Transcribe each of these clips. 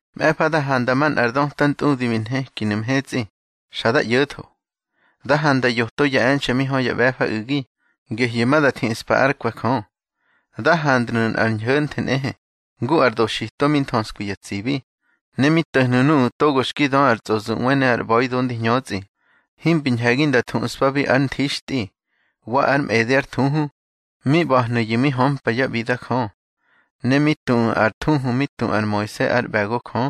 Mꞌe̱fa da handa manꞌa ar döta ntꞌudi bi nhekinu̱ mhetsꞌi, xa da ꞌyo̱tho. Da handa yoto ya e̱nxe̱ mi hö ya ꞌbe̱fa u̱gi, gehyu̱ ma da thiꞌspa ár kwe̱ Jö. Da handnu̱ nꞌar ñho̱nthe nꞌehe, ngu ar doxito mi nthöskwi ya tsibi. Ne mi to̱hnu̱ nuꞌu̱ togo xki dö ar tsꞌozuꞌwe ne ar ꞌba̱ido ndi hñötsꞌi, himbi ñhe̱gi nda thuꞌspabi ár nthixtꞌi, wa ár mꞌede ár thuhu. Mi ꞌba̱hnu̱yu̱ mi hömpa yá ꞌbida Jö. Ne mi tuꞌu̱ ar thuhu mi tu ar Moise ár ꞌbe̱go Jö,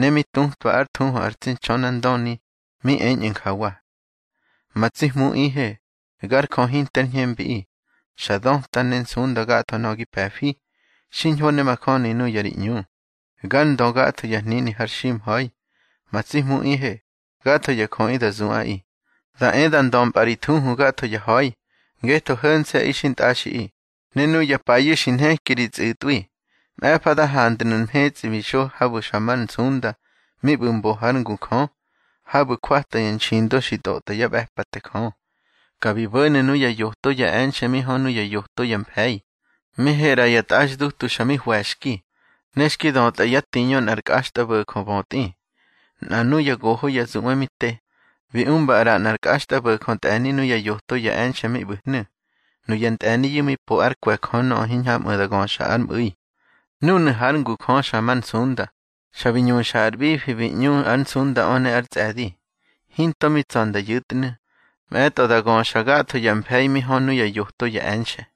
ne mi tutwa ár thuhu ar tsi Ntxönandöni, mi eñꞌu̱ njawa: Ma tsi Hmuꞌihe, gar Jö hinte ár ñhembiꞌi, xa döta ne nsunda gatho nöꞌö gi pe̱fi. Xiñho ne majöni nuya ri ꞌñu. Gár Ndö gatho ya hnini har ximha̱i. Ma tsi Hmuꞌihe, gatho ya jöꞌi da zuꞌaꞌi. Da e da ndömpꞌa ri thuhu gatho ya ha̱i, ngetho ho̱nse̱ꞌi xintꞌaxiꞌi, ne nuya payu̱ xi nheki ri tsꞌu̱tꞌwi. Mꞌe̱fa da handnu̱ mhetsꞌi bi xo habu̱ xa mar nsunda mi ꞌbu̱ mbo hár ngu Jö, habu̱ jwata ya nxindo xi tꞌotꞌa yá ꞌbe̱pate Jö. Ka bi bo̱nu̱ nuya yoto ya e̱nxe̱ mi hö nuya yoto ya mfe̱i, mi he ꞌra ya tꞌaxdutu xa mi hwe̱xki, ne xki dötꞌa yá tiñö nꞌar kꞌaxtꞌabo̱jö bötꞌi. Nꞌa nuya goho ya zuꞌwe mi te, bi umba ꞌra nꞌar kꞌaxtꞌabo̱jö ntꞌe̱ni nuya yoto ya e̱nxe̱ mi ꞌbu̱hnu̱. Nuya ntꞌe̱niyu̱ mi po ár kwe̱ Jö nöꞌö hiñhamꞌu̱ da göxa ár mꞌu̱i. Núnu̱ hár ngu Jö xa mar nsunda, xa bi ñuxa ar ꞌbifi bi ꞌñu ár nsundaꞌö ne ár tsꞌe̱di. Hinto mi tsa̱ nda yu̱tnu̱, mꞌe̱tꞌo da göxa gatho ya mfe̱i mi hö nuya yoto ya e̱nxe.